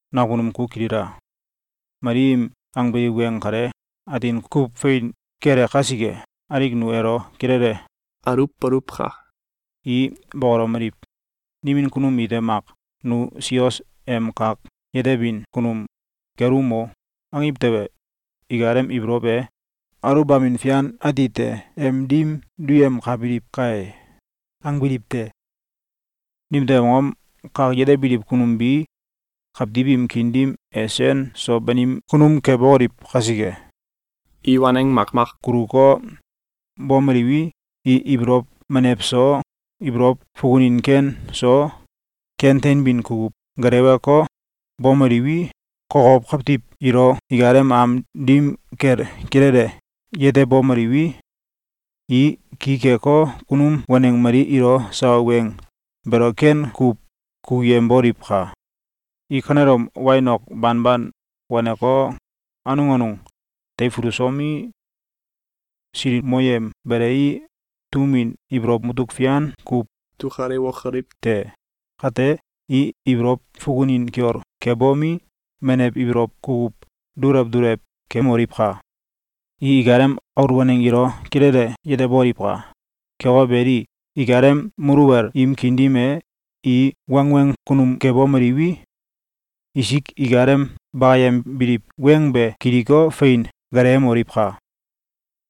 Nakunum ku kilila! Mali im angbiliw weng kale atin kuw fein kele kasike, alik nu elo kilele aluwboluwka! I bokolomeliw: “Nimin kunum ite mak ‘Nu sios em kak yetebin kunum kelum o!’, angiw tewe, ikalem ibolow e aluwbamin fian atite em dim duyemkabiliw kae!”, angbiliw te. Nimtew angom? Kak yetebiliw kunum bi kawtiw im kiin dim e sen so banim kunum kebokoliw kasike. I waneng makmak kuluko, bomeliwi, i ibolow menew so, ibolow fukunin ken so, ken teinbin kukuw gelewko, bomeliwi, kokow kawtiw ilo ikalem am dim kel kilele yetemomeliwi, i ki keko, kunum waneng mali ilo sawa weng beelo ken kuw kukuyemboliwka! I kanelom wain ok banban waneko, anung anung teifulusomi, silikmoyem belei, tum win ibolow mutuk fian kuw dukalewokoliw te! Kate, i ibolow fukunin kiol kebomi, menew ibolow kukuw dulew dulew kemoliwka! I ikalem aul waneng ilo kilele yeteboliwka! Keko beli, ikalem muluwel im kiin dim e, i wangweng kunum kebomeliwi, isik ikalem bakayembiliw weng be kiliko, fein gelewemoliwka!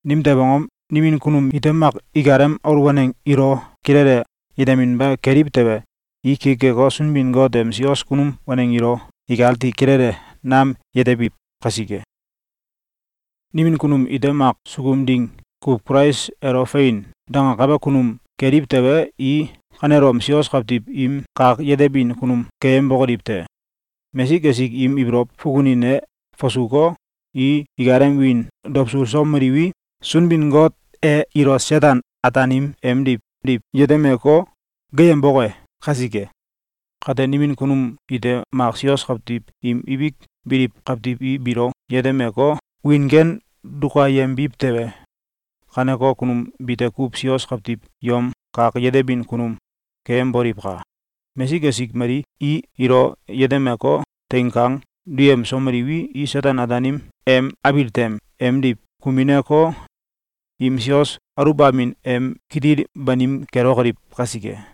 Nimtew angom? Nimin kunum ite mak ikalem aul waneng ilo kilele yeteminba keliw tewe, i ki keko, Sunbin-Got em sios kunum waneng ilo ikati kilele nam yetebiw kasike. Nimin kunum ite mak sukum ding kuw Kulais elo “Fein!”, dangakabe kunum keliw tewe, i kanelom sios kawtiw im kak yetebin kunum keyembokoliw te! Mesik esik im ibolow fukunin e fasuko, i ikalem wiin dawsulsomeliwi, Sunbin-Got e ilo Seten-Ataanim emdiw diw yetemeko, geeyemboke kasike. Kate, nimin kunum ite mak sios kawtiw im ibik biliw kawtiw i biilo yetemeko, wiin ken dukayembiw tewe, kaneko kunum bite kuw sios kawtiw yom kak yetebin kunum keyemboliwka! Mesik esik mali i ilo yetemeko, teing kang duyemsomeliwi, i Seten-Ataanim em abil tem emdiw kumineko, im sios aluwbamin em kitil banim kelokoliw kasike.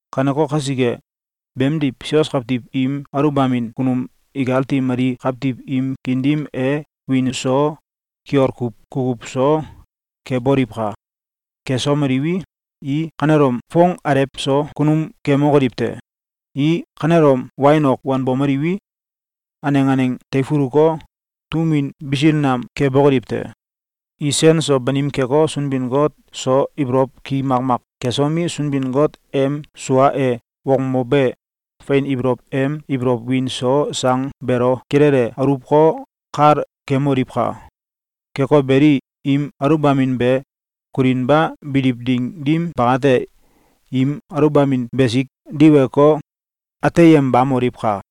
Kaneko kasike, beemdiw, sios kawtiw im aluwbamin kunum ikati mali kawtiw im kiin dim e wiin so kiol kuw kukuw so keboliwka! Kesomiliwi, i kanelom foong alew so kunum kemokoliw te! I kanelom wain ok wanbomeliwi, aneng aneng teifuluko, tum win bisil nam kebokoliw te! I sen so banim keko, Sunbin-Got so ibolow ki makmak kesomi, Sunbin-Got em sua e wokmobe fein ibolow em ibolow win so sang beelo kilele aluwko, kal kemoliwka! Keko beli, im aluwbamin be kulinba biliw ding dim bakate, im aluwbamin besik diweko, ateyembamoliwka!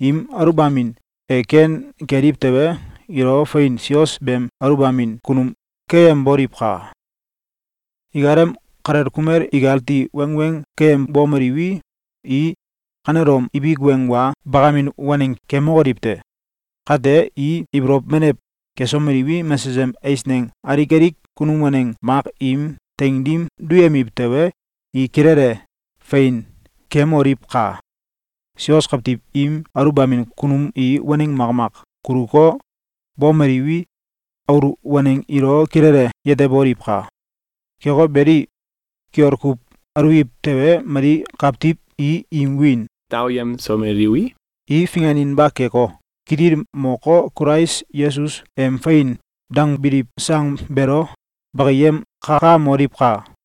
Im aluwbamin e ken keliw tewe, ilo fein sios beem aluwbamin kunum keyemboliwka! Ikalem kalel kumel ikati wangweng keyembomeliwi, i kanelom ibik weng wa bakamin waneng kemokoliw te! Kate, i ibolow menew kesomeliwi, mesesem eisneng alik alik kunum waneng mak im teing dim duyemiw tewe, i kilele fein kemoliwka! Sios kawtiw im aluwbamin kunum i waneng makmak kuluko, bomeliwi, aul waneng ilo kilele yeteboliwka! Keko beli, kiol kuw aluwiw tewe, mali kawtiw i im wiin daoyemsomeliwi, i finganinba keko, kitil moko, Kulais Yesus em “Fein!”, dangbiliw sang beelo bakayem kakamoliwka!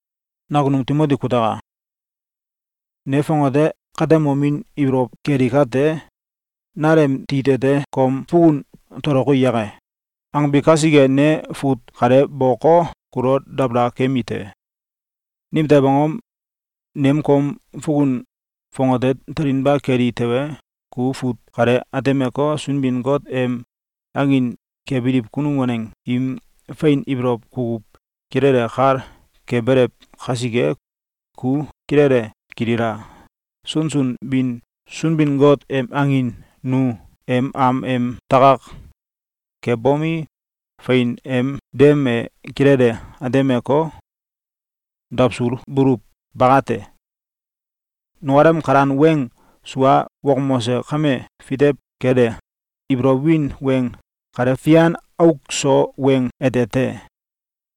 Nakunum Timoti kutaka! Ne fongate katemomin ibolow keli kate, “Nal em tit ete kom fukun toloki yake?”, angbi kasike, ne fut kale boko, kulo dabala kemi te. Nimtew angom? Nem kom fukun fongate telinba keli tewe, ku fut kale atemeko, Sunbin-Got em angin kebiliw kunum waneng im fein ibolow kukuw kilele kal kebelew kasike. Ku kilele kilila! Sunsun bin Sunbin-Got em angin nu em am em takak kebomi, fein em dem e kilele atemeko, dawsulbuluw bakate. Nukalem kalan weng sua wokmose kame fitew kele ibolow win weng kale fian auk so weng ete te.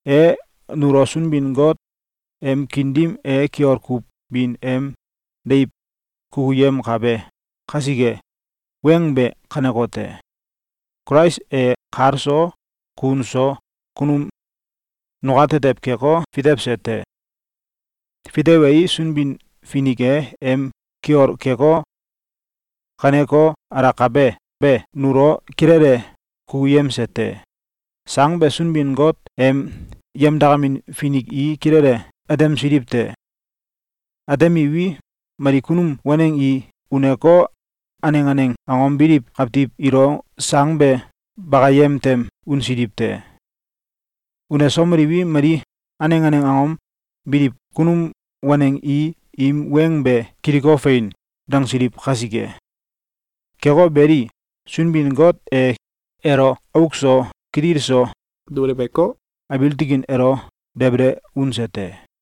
E nulo Sunbin-Got em kiin dim e kiol kuw bin em deiw kukuyemkabe kasike. Weng be kanekote: Kulais e kal so kun so kunum nukatetew keko, fitewse te. Fitewei, Sunbin-Finik e em kiol keko, kaneko alakabe be nulo kilele kukuyemse te. Sang be Sunbin-Got em yemdakamin finik i kilele atemsiliw te. Atemiwi, mali kunum waneng i uneko, aneng aneng angom biliw kawtiw ilo sang be bakayem tem unsiliw te. Unesomeliwi, mali aneng aneng angom biliw kunum waneng i im weng be kiliko, “Fein!”, dangsiliw kasike. Keko beli, Sunbin-Got e elo auk so kitil so duleweko, abiil tikin elo debele unse te.